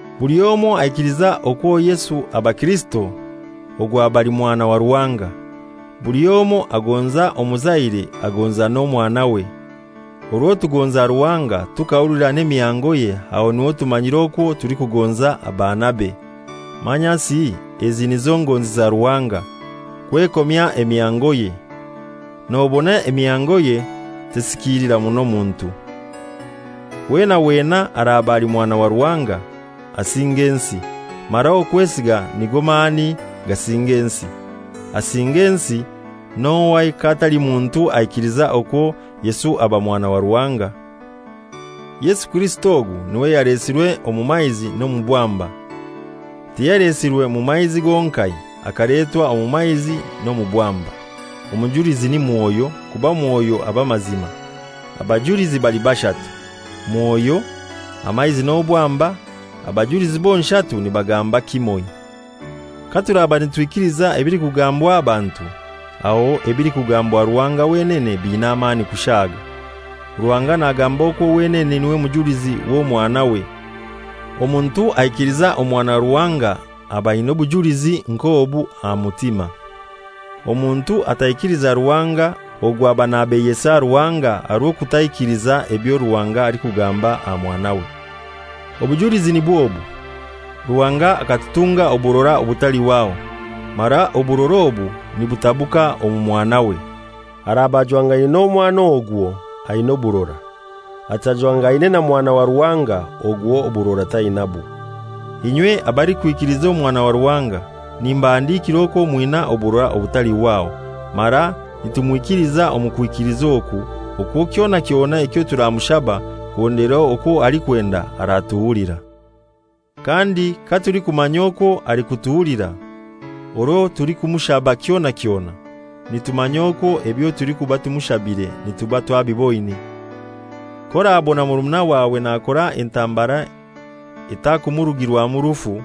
Buli omoi aikiliza okwo Yesu aba Kirisito, ogwo aba ali mwana wa Ruhanga. Buli omoi agonza omuzaire agonza n'omwanawe. Orwo tugonza Ruhanga tukahulira n'emihangoye aho niho tumanyira okwo tulikugonza abaanabe. Manyasi ezi nizo ngonzi za Ruhanga: Kwekomya emihangoye. Nobona emihangoye tesikiilira muno muntu. Wena wena araba ali mwana wa Ruhanga asinga ensi; mara okwesiga nigo mani gasinga ensi. Asinga ensi n'ohai k'atali muntu aikiliza okwo Yesu aba Mwana wa Ruhanga? Yesu Kirisito ogu niwe yalesirwe omu maizi n'omubwamba. Tiyalesirwe mu maizi gonkai, akaletwa omu maizi n'omubwamba. Omujulizi ni Mwoyo, kuba Mwoyo aba mazima. Abajulizi bali bashatu: Mwoyo, amaizi n'obwamba; abajulizi bonshatu nibagamba kimoi. Katuraba nitwikiliza ebilikugambwa abantu, aho ebilikugambwa Ruhanga wenene biina amani kushaaga. Ruhanga nagamba okwo wenene niwe mujulizi w'Omwanawe. Omuntu aikiliza Omwana wa Ruhanga aba aina obujulizi nk'obu aha mutima. Omuntu ataikiliza Ruhanga ogwo aba nabeiyesa Ruhanga aha rw'okutaikiliza ebyo Ruhanga alikugamba aha Mwanawe. Obujulizi nibw'obu: Ruhanga akatutunga oburora obutalihwaho, mara oburora obu nibutabuka omu Mwanawe. Araba ajwangaine n'omwana ogwo aina oburora; atajwangaine na Mwana wa Ruhanga ogwo oburora tainabwo. Inywe abalikwikiliza Omwana wa Ruhanga, nimbahandikira okwo mwina oburora obutalihwaho. Mara nitumwikiliza omu kwikiliza oku, okwo kyona kyona ekyo turamushaba kuhondera okwo alikwenda aratuhulira. Kandi katulikumanya okwo alikutuhulira orwo tulikumushaba kyona kyona, nitumanya okwo ebyo tulikuba tumushabire nituba twabiboine. K'orabona murumuna wawe nakora entambara etakumurugirwamu rufu,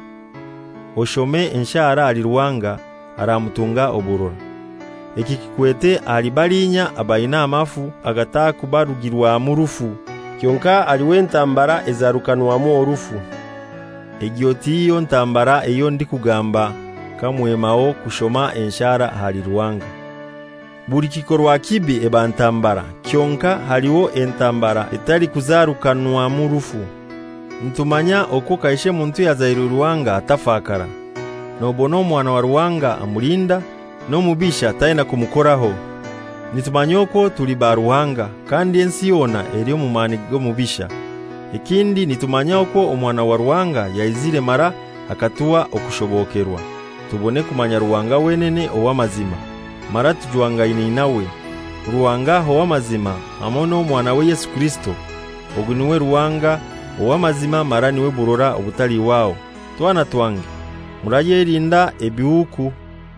oshome enshara ahali Ruhanga, aramutunga oburora. Eki kikwete ahali balinya abaina amafu agatakubarugirwamu rufu. Kyonkai haliho entambara ezarukanwamu orufu; egyo tiyo ntambara eyo ndikugamba kamwemaho kushoma enshara ahali Ruhanga. Buli kikorwa kibi eba ntambara, kyonkai haliho entambara etalikuzarukanwamu rufu. Nitumanya okwo kaishe muntu ayazairwe Ruhanga atafakara, nobona Omwana wa Ruhanga amulinda, n'omubisha taina kumukoraho. Nitumanya okwo tuli ba Ruhanga, kandi ensi yona eli omu mani g'omubisha. Ekindi nitumanya okwo Omwana wa Ruhanga yaizire mara akatuha okushobokerwa, tubone kumanya Ruhanga wenene ow'amazima; mara tujwangaine nawe, Ruhanga ow'amazima, hamoi n'Omwanawe Yesu Kirisito. Ogu niwe Ruhanga ow'amazima mara niwe burora obutalihwaho. Twana twange, murayelinda ebihuuku.